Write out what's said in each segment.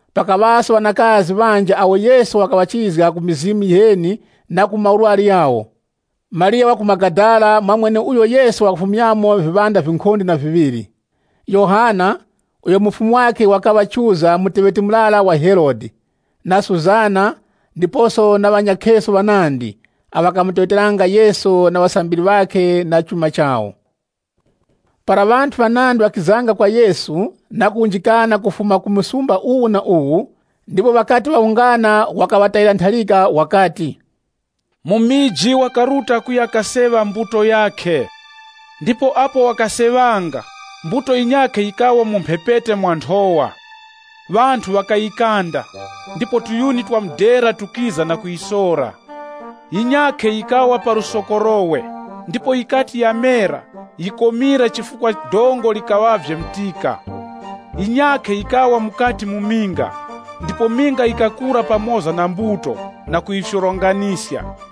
Pakaŵaso ŵanakazi ŵanji awo Yesu wakaŵachizga ku mizimu yiheni na ku maurwari ghawo. Mariya wa ku Magadala mwa mweneuyo Yesu wakafumyamo viŵanda vinkhonde na viŵiri, Yohana, uyo mufumu wakhe wakaŵa Chuza muteŵeti murara wa Herode, na Susana, ndiposo na ŵanyakheso ŵanandi, awo ŵakamuteŵeteranga Yesu na ŵasambiri ŵakhe na chuma chawo. Para ŵanthu ŵanandi ŵakizanga kwa Yesu na kuwunjikana kufuma ku muzi uwu na uwu, ndipo ŵakati ŵawungana wakaŵatayira ntharika wakati, “Mumiji wakaruta kuya kaseŵa mbuto yakhe. Ndipo apo wakaseŵanga, mbuto yinyakhe yikawa mu mphepete mwa nthowa. Ŵanthu ŵakayikanda, ndipo viyuni vya mudera vikiza na kuyisora. Yinyakhe yikawa pa lusokorowe, ndipo yikati yamera, yikomira chifukwa dongo likaŵavye mtika. Yinyakhe yikawa mukati mu minga, ndipo minga yikakura pamoza na mbuto na kuyifyoronganiska.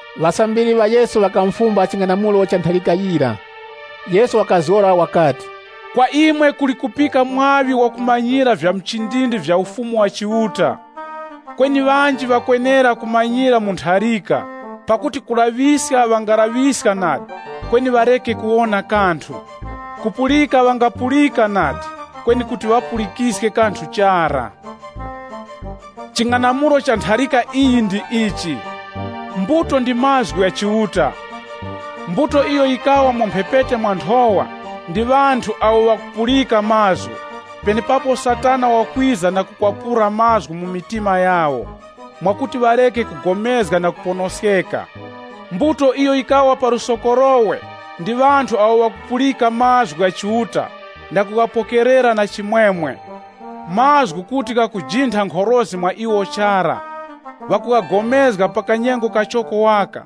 Ŵasambiri ŵa Yesu ŵakamufumba ching'anamulo cha ntharika yira. Yesu wakazgora wakati, Kwa imwe kuli kupika mwaŵi wakumanyira vya muchindindi vya Ufumu wa Chiuta. Kweni ŵanji ŵakwenera kumanyira mu ntharika, pakuti kulaŵiska ŵangalaŵiska nadi, kweni ŵareke kuwona kanthu, kupulika ŵangapulika nadi, kweni kuti wapulikiske kanthu chara. (LXX) “Ching'anamulo cha ntharika iyi ndi ichi: Mbuto ndi mazgu gha Chiuta. Mbuto iyo yikawa mu mphepete mwa nthowa, ndi ŵanthu awo ŵakupulika mazgu, penepapo Satana wakwiza na kukwapura mazgu mu mitima yawo, mwakuti ŵareke kupulikana na kuponoskeka. Mbuto iyo yikawa pa lusokorowe, ndi ŵanthu awo ŵakupulika mazgu gha Chiuta na kughapokerera na chimwemwe. Mazgu kuti ghakujintha nkhorozi mwa iwo chara. Ŵakupulikana pa kanyengo kachoko waka,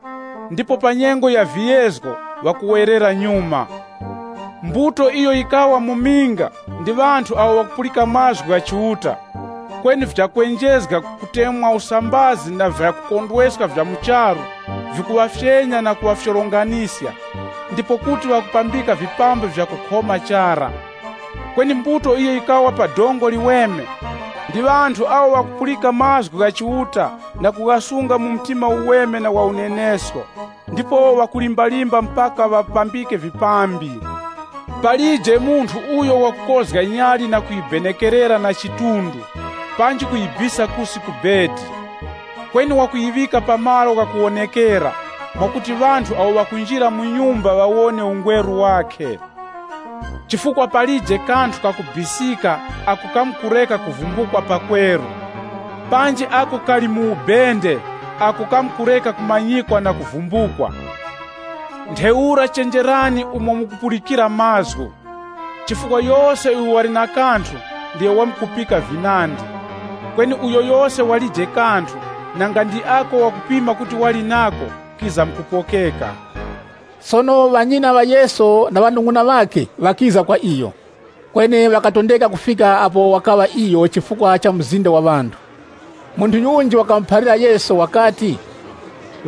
ndipo pa nyengo ya viyezgo, ŵakuwerera nyuma. Mbuto iyo yikawa mu minga, ndi ŵanthu awo ŵakupulika mazgu gha Chiuta, kweni vyakwenjezga, kutemweska usambazi na vyakukondweska vya mu charu, vikuŵafyenya na kuŵafyoronganiska, ndipo kuti ŵakupambika vipambi vya kukhoma chara. Kweni mbuto iyo yikawa pa dongo liweme, ndi ŵanthu awo ŵakupulika mazgu gha Chiuta na kughasunga mu mtima uweme na wa unenesko, ndipo ŵakulimbalimba mpaka ŵapambike vipambi. “Palije munthu uyo wakukozga nyali na kuyibenekerera na chidunga, panji kuyibisa kusi ku chitara. Kweni wakuyiŵika pa malo ghakuwonekera, mwakuti ŵanthu awo ŵakunjira mu nyumba ŵawone ungweru wakhe. “Chifukwa palije kanthu kakubisika ako kamkureka kuvumbukwa pakweru, panji ako kali mu ubende ako kamkureka kumanyikwa na kuvumbukwa. “Ntheura chenjerani umo mukupulikira mazgu. Chifukwa yose uyo wali na kanthu, ndiyo wamkupika vinandi. Kweni uyo yose walije kanthu, nanga ndi ako wakupima kuti wali nako kizamkupokeka.” Sono ŵanyina ŵa Yesu na ŵanung'una ŵakhe ŵakiza kwa iyo, kweni ŵakatondeka kufika apo wakaŵa iyo chifukwa cha mzinda wa ŵanthu. Munthu yunji wakamuphalira Yesu wakati,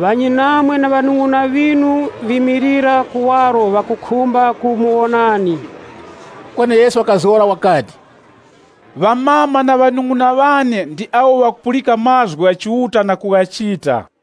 “Ŵanyinamwe na ŵanung'una ŵinu ŵimilira kuwaro ŵakukhumba kumuwonani.” Kweni Yesu wakazgora wakati, “Amama na ŵanung'una ŵane ndi awo ŵakupulika mazgu gha Chiuta na kughachita.”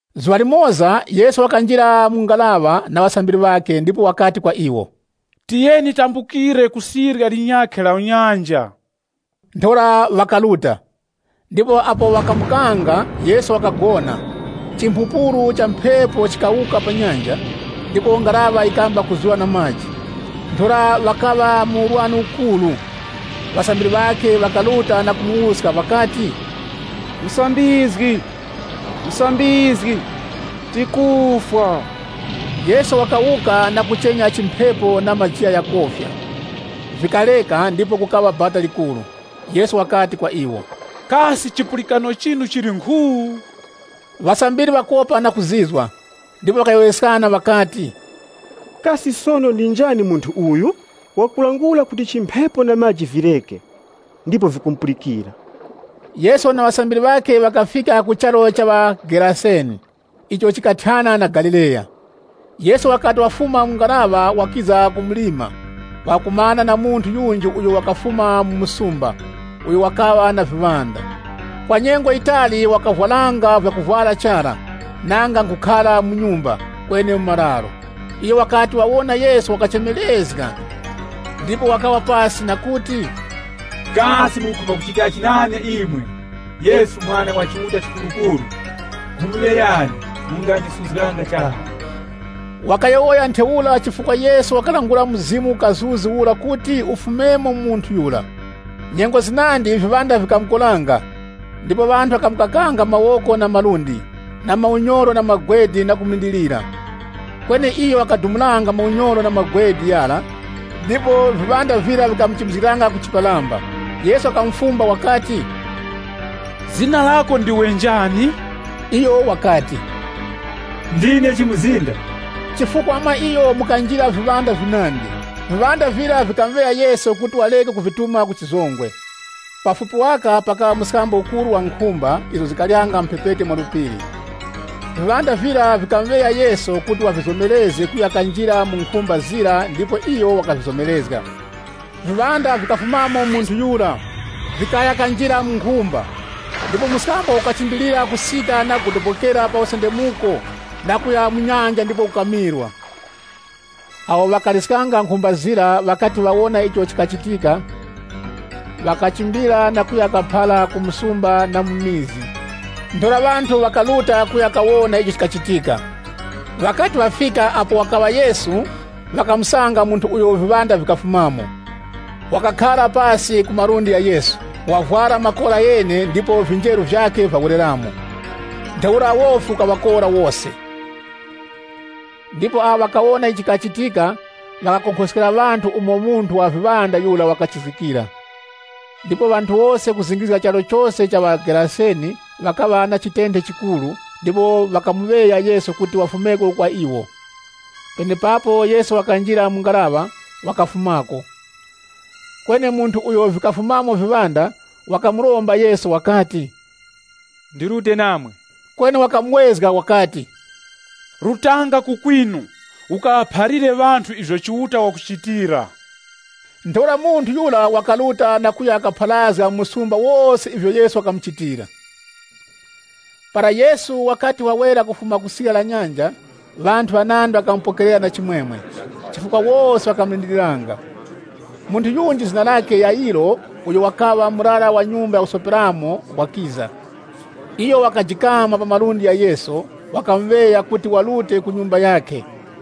Zuŵa limoza, Yesu wakanjira mu ngaraŵa na ŵasambiri ŵakhe ndipo wakati kwa iwo, “Tiyeni tambukire ku sirya linyakhe la nyanja.” Ntheura ŵakaruta. Ndipo apo ŵakambukanga, Yesu wakagona. Chimphupuru cha mphepo chikikhira pa nyanja, ndipo ngaraŵa yikamba kuzura na maji. Ntheura ŵakaŵa mu urwani ukuru. Ŵasambiri ŵakhe ŵakaruta na kumuwuska ŵakati, “Musambizgi, Musambizgi, tikufwa!” Yesu wakawuka na kuchenya chimphepo na majigha ghakofya. Vikareka ndipo kukaŵa bata likuru. Yesu wakati kwa iwo, “Kasi chipulikano chinu chili nkhu?” Ŵasambiri ŵakopa na kuzizwa ndipo ŵakayowoyeskana ŵakati, “Kasi sono ndi njani munthu uyu? Wakulangula kuti chimphepo na maji vireke, ndipo vikumupulikira.” Yesu na ŵasambiri ŵakhe ŵakafika ku charu cha ŵa Geraseni, icho chikathyana na Galileya. Yesu wakati wafuma mu ngaraŵa wakiza ku mlima, wakakumana na munthu yunji uyo wakafuma mu msumba, uyo wakaŵa na viŵanda. Kwa nyengo yitali wakavwaranga vyakuvwara chara, nanga nkhukhara mu nyumba, kweni mu mararo. Iyo wakati wawona Yesu, wakachemerezga, ndipo wakawa pasi, na kuti, “Kasi mukukhumba kuchitachi nane imwe, Yesu Mwana wa Chiuta Chikurukuru? Nkhumuŵeyani, mungandisuzganga chara.” Wakayowoya ntheura chifukwa Yesu wakalangula mzimu uheni ura kuti ufumemo mu munthu yura. Nyengo zinandi mizimu yiheni yikamukoranga, ndipo ŵanthu ŵakamukakanga mawoko na malundi na maunyoro na magwede ndipo ŵakamulindiriranga. Kweni iyo wakadumulanga maunyoro na magwede ghara ndipo mizimu yiheni yira yikamuchimbizgiranga ku chiparamba. Yesu wakamufumba wakati, “Zina lako ndiwe njani?” Iyo wakati, “Ndine Chimuzinda.” Chifukwa mwa iyo mukanjira viŵanda vinandi. Viŵanda vira vikamuŵeya Yesu kuti wareke kuvituma ku chizongwe. Pafupi waka pakaŵa mskambo ukuru wa nkhumba izo zikaryanga mu mphepete mwa phiri. Viŵanda vira vikamuŵeya Yesu kuti wavizomerezge kuya kanjira mu nkhumba zira ndipo iyo wakavizomerezga. Viŵanda vikafumamo mu munthu yura vikaya kanjira mu nkhumba. Ndipo mskambo ukachimbilira kusika na kugodobokera pa usendemuko na kuya mu nyanja ndipo ukamirwa. Awo ŵakaliskanga nkhumba zira ŵakati ŵawona icho chikachitika, ŵakachimbira na kuya kaphara ku msumba na mu mizi. Ntheura ŵanthu ŵakaruta kuya kawona icho chikachitika. Ŵakati ŵafika apo wakaŵa Yesu, ŵakamusanga munthu uyo viŵanda vikafumamo, wakakhara pasi ku malundi gha Yesu, wavwara makora ghene ndipo vinjeru vyakhe vyawereramo. Ntheura wofi ukaŵakora wose. Ndipo awo ŵakawona icho chikachitika, ŵakakonkhoskera ŵanthu umo munthu wa viŵanda yura wakachizgikira. Ndipo ŵanthu wose kuzingirizga charu chose cha ŵa Geraseni ŵakaŵa na chitenthe chikuru ndipo ŵakamuŵeya Yesu kuti wafumeko kwa iwo. Penepapo Yesu wakanjira mu ngaraŵa, wakafumako. Kweni munthu uyo vikafumamo viŵanda, wakamuromba Yesu, “Ndirute namwe.” Kweni wakamuwezga wakati, “Rutanga ku kwinu, ukaŵaphalire ŵanthu ivyo Chiuta wakuchitira.” Ntheura munthu yura wakaruta na kuya kapharazga mu msumba wose ivyo Yesu wakamuchitira. Para Yesu wakati wawera kufuma ku sirya la nyanja, ŵanthu ŵanandi ŵakamupokerera na chimwemwe, chifukwa wose ŵakamulindiriranga. Munthu yunji zina lakhe Yayiro uyo wakaŵa murara wa nyumba ya kusoperamo, wakiza. Iyo wakajikama pa malundi gha Yesu, wakamuŵeya kuti warute ku nyumba yakhe.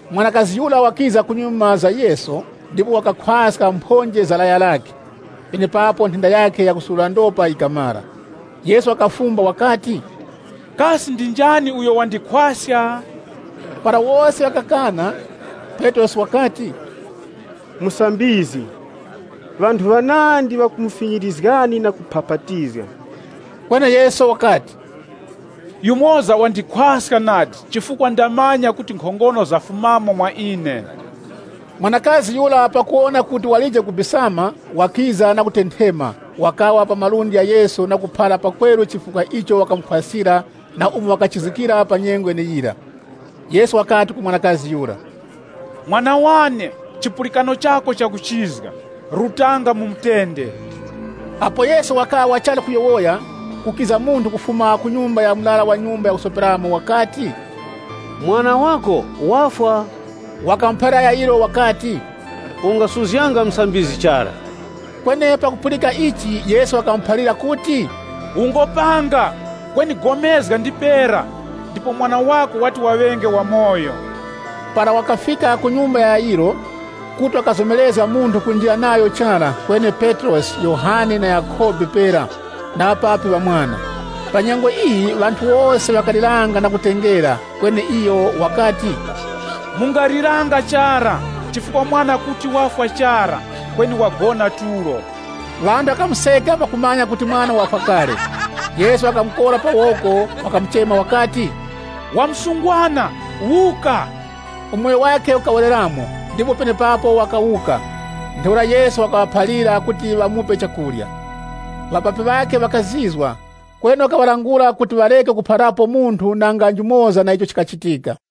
Mwanakazi yura wakiza kunyuma za Yesu, ndipo wakakhwaska mphonje za laya lakhe. Penepapo nthenda yakhe yakusurura ndopa yikamara. Yesu wakafumba wakati, “Kasi ndi njani uyo wandikhwaska?” Para wose ŵakakana, Petrosi wakati, “Musambizgi, ŵanthu ŵanandi ŵakumufinyirizgani na kuphapatizga.” Kweni Yesu wakati, “Yumoza wandikhwaska nadi chifukwa ndamanya kuti nkhongono zafumamo mwa ine.” Mwanakazi pakuwona kuti walije kubisama, wakiza na kutenthema, wakawa pa malundi gha Yesu na kuphara pakweru chifukwa icho wakamukhwaskira na umo wakachizgikira pa nyengo yeneyira. Yesu wakati ku mwanakazi yura, “Mwana wane, chipulikano chako chakuchizga. Rutanga mu mutende.” Apo Yesu wakaŵa wachali kuyowoya, kukiza munthu kufuma ku nyumba ya murara wa nyumba ya kusoperamo ndipo wakati kwa Yayiro, “Mwana wako wafwa, ungasuzganga Musambizgi chara.” Kweni pakupulika ichi Yesu wakamuphalira kuti, “Ungopanga, kweni pulikana ndipera, ndipo mwana wako wati waŵenge wamoyo.” Para wakafika ku nyumba ya Yayiro, kuti wakazomerezga munthu kunjira nayo chara, kweni Petrosi, Yohane na Yakhobe pera na ŵapapi ŵa mwana. Pa nyengo iyi, ŵanthu wose ŵakaliranga na kutengera, kweni iyo wakati, “Mungaliranga chara, chifukwa mwana kuti wafwa chara, kweni wagona tulo.” Ŵanthu ŵakamuseka pakumanya kuti mwana wafwa kale. Yesu wakamukora pa woko, wakamuchema wakati, “Wa msungwana, wuka!” Umoyo wakhe ukawereramo, ndipo penepapo wakawuka. Ntheura Yesu wakaŵaphalira kuti ŵamupe chakurya. Ŵapapi ŵakhe ŵakazizwa, kweni wakaŵalangula kuti ŵareke kuphalirapo munthu nanga njumoza na icho chikachitika.